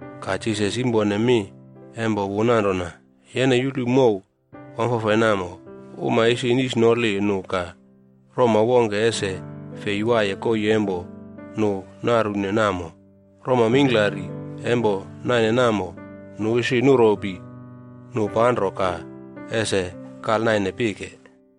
Ka Jisas yimpone mi empo wu nanrona, “Yene yulu mow wamfafai namo. Uma ese nisnoli nu ka roma wongke ese fei waiye koii empo nu narune namo. Roma mingklari empo naine namo, nu ese nuropi nu panro ka ese kalnaine pike.”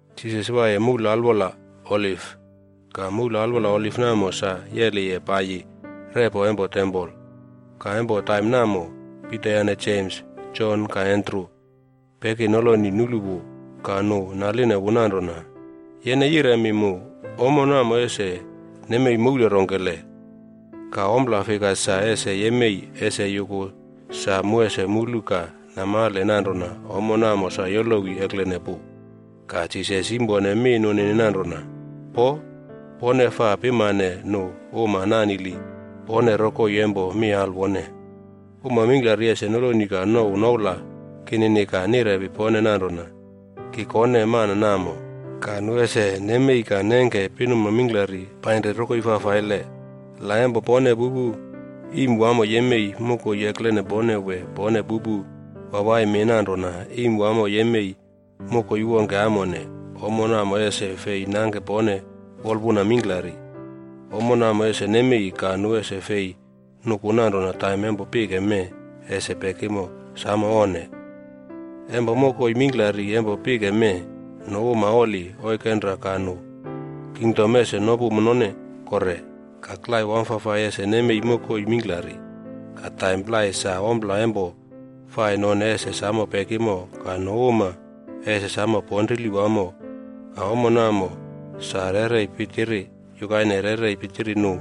Jisas waiye moule alwola Oliv. Ka moule alwola Oliv namo sa yeliye paiyi repo empo tempol. Ka empo taim namo, Pita yane Jems, Jon ka Andru peki noloni nulu wu. Ka nu naline wu nanrona, “Yene yiremi mu, ommo namo ese nemei moule rongkele? Ka ompla fika sa ese yemei ese yuku sa mu ese mulu ka namale nanrona ommo namo sa yolowi eklene pu?” Ka Jisas yimpone mi nunini nanrona, “Poo! Pone faa pimane nu uma nanili pone rokoi empo mi alwone. Uma mingklari ese noloni ka nouw noula kinini ka nirepi pone nanrona, ‘Ki kone mana namo,’ ka nu ese nemi ka nengke pinuma mingklari painri rokoi fafaile.” “La empo pone pupu iim wamo yemei mokoi eklene pone wee pone pupu wawai mi nanrona iim wamo yemei mokoi wongke amone, ommo namo ese fei nangke pone wolpuna mingklari. Ommo namo ese nemei, ka nu ese fei nuku nanrona taim empo pike mee ese pekimo. Samo onne! Empo mokoi mingklari empo pike mee, nu uma oli oikenra ka nu kingdom ese nopu none kore. Ka klai wamfafai ese nemei mokoi mingklari. Ka taim plai sa ompla empo fai none ese samo pekimo ka nu uma ese samo ponrili wamo. Ka ommo namo sa rerei pitiri yukaine rerei pitiri nu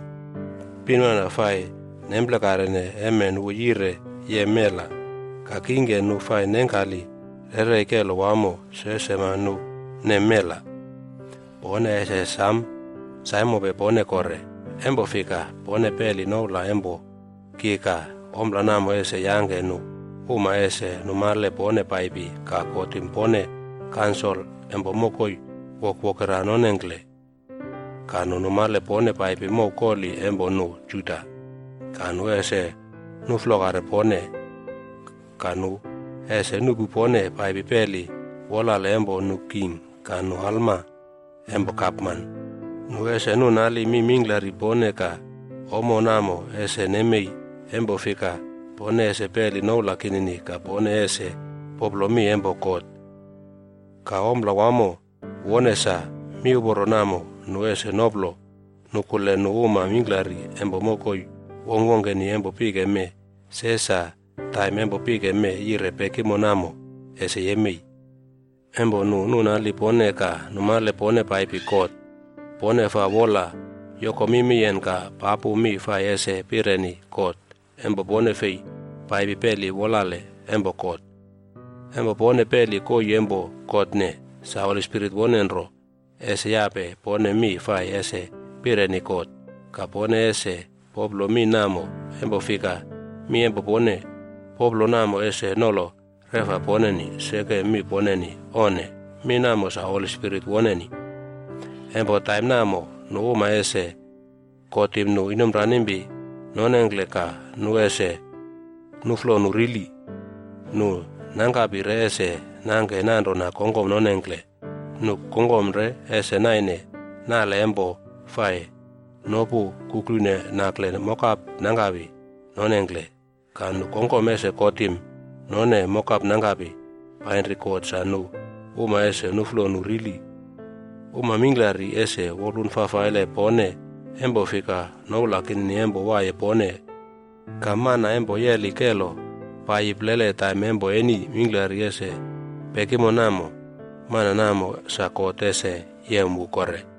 pinmana fai nemplekarene emen wu yire yem mela. Ka kingke nu fai nengkali rerei kelo wamo, se sema nu nem mela.” “Pone ese sam saimope pone kore. Empo fika, pone peli noula empo ki ka ompla namo ese yangke nu uma ese numale pone paipi ka kotim pone kansol empo mokoi wokwokera nonengkle, ka numale pone paipi mow koli empo nu Juda, ka nu ese nuflokare pone. Ka nu ese nuꞌpu pone paipi peli wolale empo nu king ka nu alma empo gapman. Nu ese nunali mi mingklari pone ka ommo namo ese nemei empo fika pone ese peli noula kinini ka pone ese poplo mi empo God. Ka ompla wamo wone sa, miuporo namo nu ese noplo nukule nu uma mingklari empo mokoi wongkwongkeni empo pike mee se sa taim empo pike mee yire pekimo namo, ese yemei. Empo nu nunali pone ka numale pone paipi kot, pone faa wola yoko mimiyen ka papu mi fai ese pireni kot empo pone fei paipi peli wolale empo kot. Empo pone peli koii empo kotne, sa Holi Spirit wone nro ese yape pone mi fai ese pireni kot. Ka pone ese poplo mi namo empo fika mi empo pone poplo namo ese nolo reꞌfa poneni, seke mi poneni. Onne! Mi namo sa Holi Spirit woneni.” “Empo taim namo, nu uma ese kotim nu inomranimpi nonengkle ka nu ese nuflo nu rili. Nu nangkapi re ese nangke nanrona nu kongkom nonengkle. Nu kongkom re ese naine nale empo fai nopu kuklune nakle mokap nangkapi nonengkle. Ka nu kongkom ese kotim none mokap nangkapi painri kot sa nu uma ese nuflo nu rili. Uma mingklari ese wolpun fafaile pone, empo fika noula kinini empo waiye pone. Ka mana empo yeli kelo paiyi plele taim empo eni mingklari ese pekimo namo, mana namo sa God ese yem wu kore.”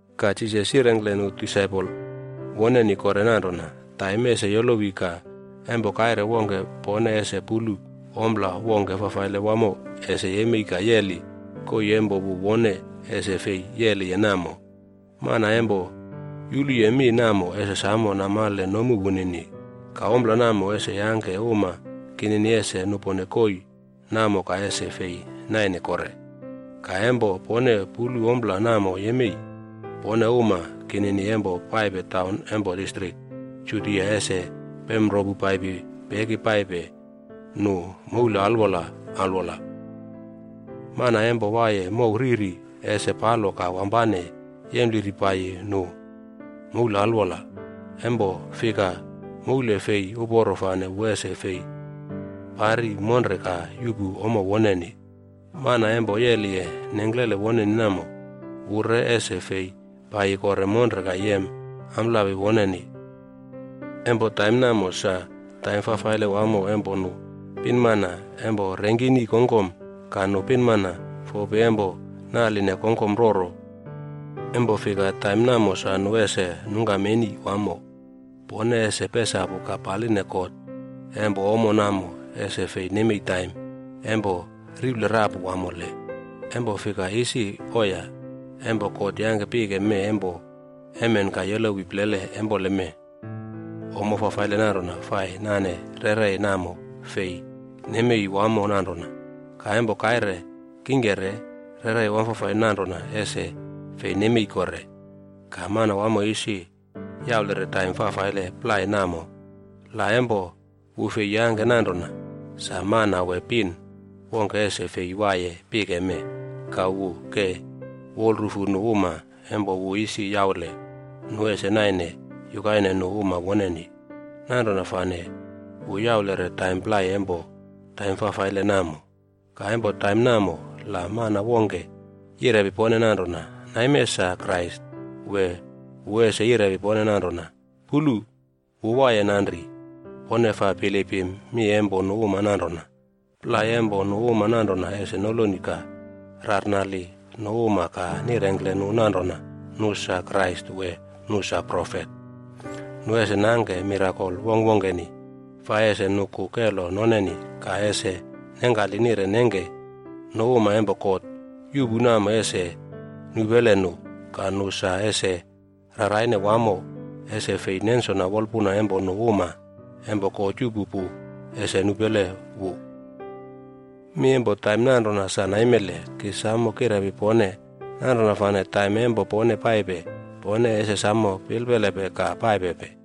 Ka Jisas yirengkle nu disaipol woneni kore nanrona, “Taim ese yolowi ka empo kaire wongke pone ese pulu ompla wongke fafaile wamo ese yemei ka yeli koii empo wu wone ese fei yeliye namo.” Mana empo yuluye mi namo ese samo namale nomu wunini. “Ka ompla namo ese yangke uma kinini ese nupone koii namo ka ese fei naine kore.a Ka empo pone pulu ompla namo yemei, pone uma kinini empo paipe taun empo distrik Judia ese pemropu paipi peki paipe nu moule alwol alwola. Mana empo waiye mow riri, ese palo ka wampane yempliri paiyi nu moule alwola. Empo fika moule fei uporo fane wu ese fei pari monre ka yuꞌpu ommo woneni. Mana empo yeliye nengklele woneni namo, wu re ese fei paiyi kore monre ka yem amplapi woneni. Empo taim namo sa taim fafaile wamo empo nu pinmana empo rengkini kongkom ka nu pinmana fopi empo naline kongkom roro. Empo fika, taim namo sa nu ese nungkam eni wamo. Pone ese pesapu ka paline God empo ommo namo ese fei nemei taim empo riple rapu wamole. Empo fika isi oiya, empo God yangke pike mee empo emen ka yolowi plele empoleme, ommo fafaile nanrona fai nane rerei namo fei nemei wamo nanrona. Ka empo kaire kingke re, rerei wamfafai nanrona ese fei nemei kore. Ka Manawamo isi yaulere taim fafaile plai namo. La empo wu fei yangke nanrona, sa mana wee pin wongke ese fei waiye pike mee. Ka wu ke wolrufu nu uma empo wu isi yaule nu ese naine yukaine nu uma woneni, nanrona fane wu yaulere taim plai empo taim fafaile namo.b” “Ka empo taim namo, la mana wongke yirepi pone nanrona, ‘Naime sa Krais’ wee wu ese yirepi pone nanrona, ‘Pulu! Wu waiye nanri.’ Pone faa bilipim mi empo nu uma nanrona. Plai empo nu uma nanrona ese noloni ka rarnali nu uma ka nirengkle nu nanrona nu sa Krais wee nu sa profet. Nu ese nangke mirakol wongkwongkeni fai ese nuku kelo noneni ka ese nengkali nire nengke nu uma empo God yuꞌpu namo ese nupele nu. Ka nu sa ese raraine wamo ese fei nensona wolpuna empo nu uma empo God yuꞌpu pu ese nupele wu. Mi empo taim nanrona sa naimele ki samo kirepi pone. Nanrona fane taim empo pone paipe, pone ese samo pilpelepe ka paipepe.”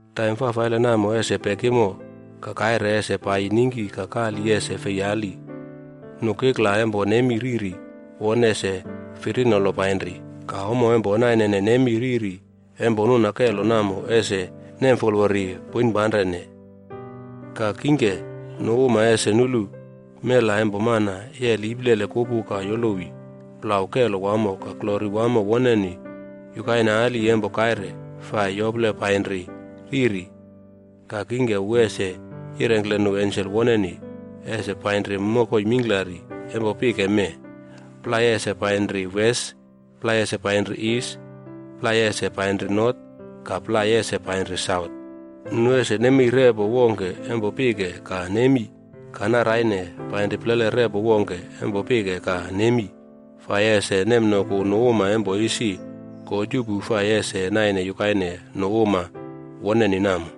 “Taim fafaile namo ese pekimo, ‘ka kaire ese paiyi ningki ka kali ese fei ali. Nu kikla empo nemi riri won ese firinolo painri, ka ommo empo nainene nemi riri empo nuna kelo namo ese nemfolwori poinpanrene.’c” “Ka kingke nu uma ese nulu ‘Mela empo Mana yeli iplele kupu ka yolowi’d plau kelo wamo ka glori wamo woneni yukaine ali empo kaire fai yople panri riri. Ka kingke wu ese yirengkle nu ensel woneni ese painri mokoi mingklari empo pike mee. Plai ese painri wes, plai ese painri is, plai ese painri not ka plai ese painri saut. Nu ese nemei repo wongke empo pike ka nemi ka naraine painri plele repo wongke empo pike ka nemi fai ese nemnoku nu uma empo isi God yuꞌpu fai ese naine yukaine nu uma woneni namo.”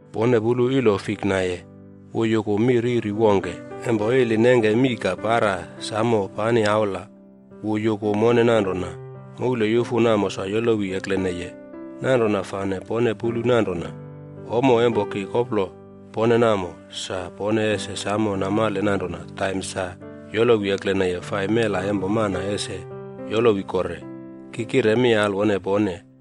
“Pone pulu ilo fik naiye. Wu yuku mi riri wongke. Empo ili nengke mii ka para samo pani aula, wu yuku mone nanrona moule yufu namo sa yolowi ekleneye. Nanrona fane pone pulu nanrona ommo empo ki koplo pone namo, sa pone ese samo namale nanrona taim sa yolowi ekleneye fai Mela Empo Mana ese yolowi kore. Ki kire mi alwone pone,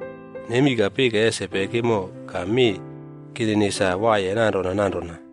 Nemi ka pike ese pekimo. Ka mi kinini sa ese waiye nanrona nanrona.”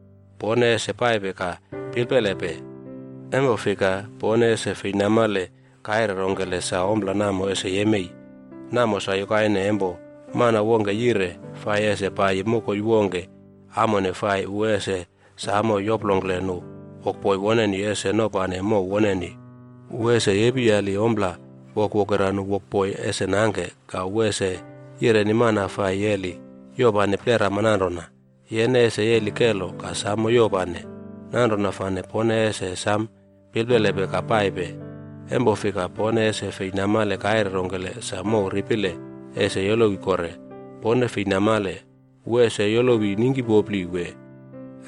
“Pone ese paipe ka pilpelepe, empo fika pone ese fei namale kaire rongkele sa ompla namo ese yemei. Namo sa yukaine empo mana wongke yire fai ese paiyi mokoi wongke amone fai wu ese samo yoplongkle nu wokboi woneni ese nopane mow woneni. Wu ese yepiyali ompla wokwokera nu wokboi ese nangke. Ka wu ese yireni mana fai yeli yopane plerama nanrona, ‘Yene ese yeli kelo ka samo yopane.’” “Nanrona fane pone ese sam pilpelepe ka paipe. Empo fika pone ese fei namale kaire rongkele sa mow ripile ese yolowi kore. Pone fei namale, wu ese yolowi ningkipopli wee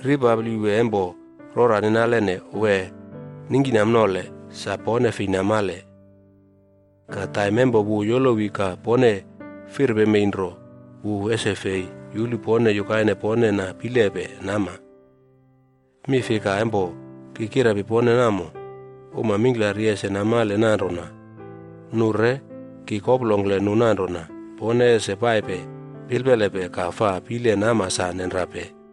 ripapli wee empo rora ninalene wee ningkinamnole, sa pone fei namale. Ka taim empo wu yolowi ka pone firpemei nro, wu ese fei yulu pone yukaine pone na pilepe nama. Mi fika empo ki kirepi pone namo, uma mingklari ese namale nanrona nu re ki koplongkle nu nanrona, ‘Pone ese paipe pilpelepe ka faa pile nama sa nenrape.’”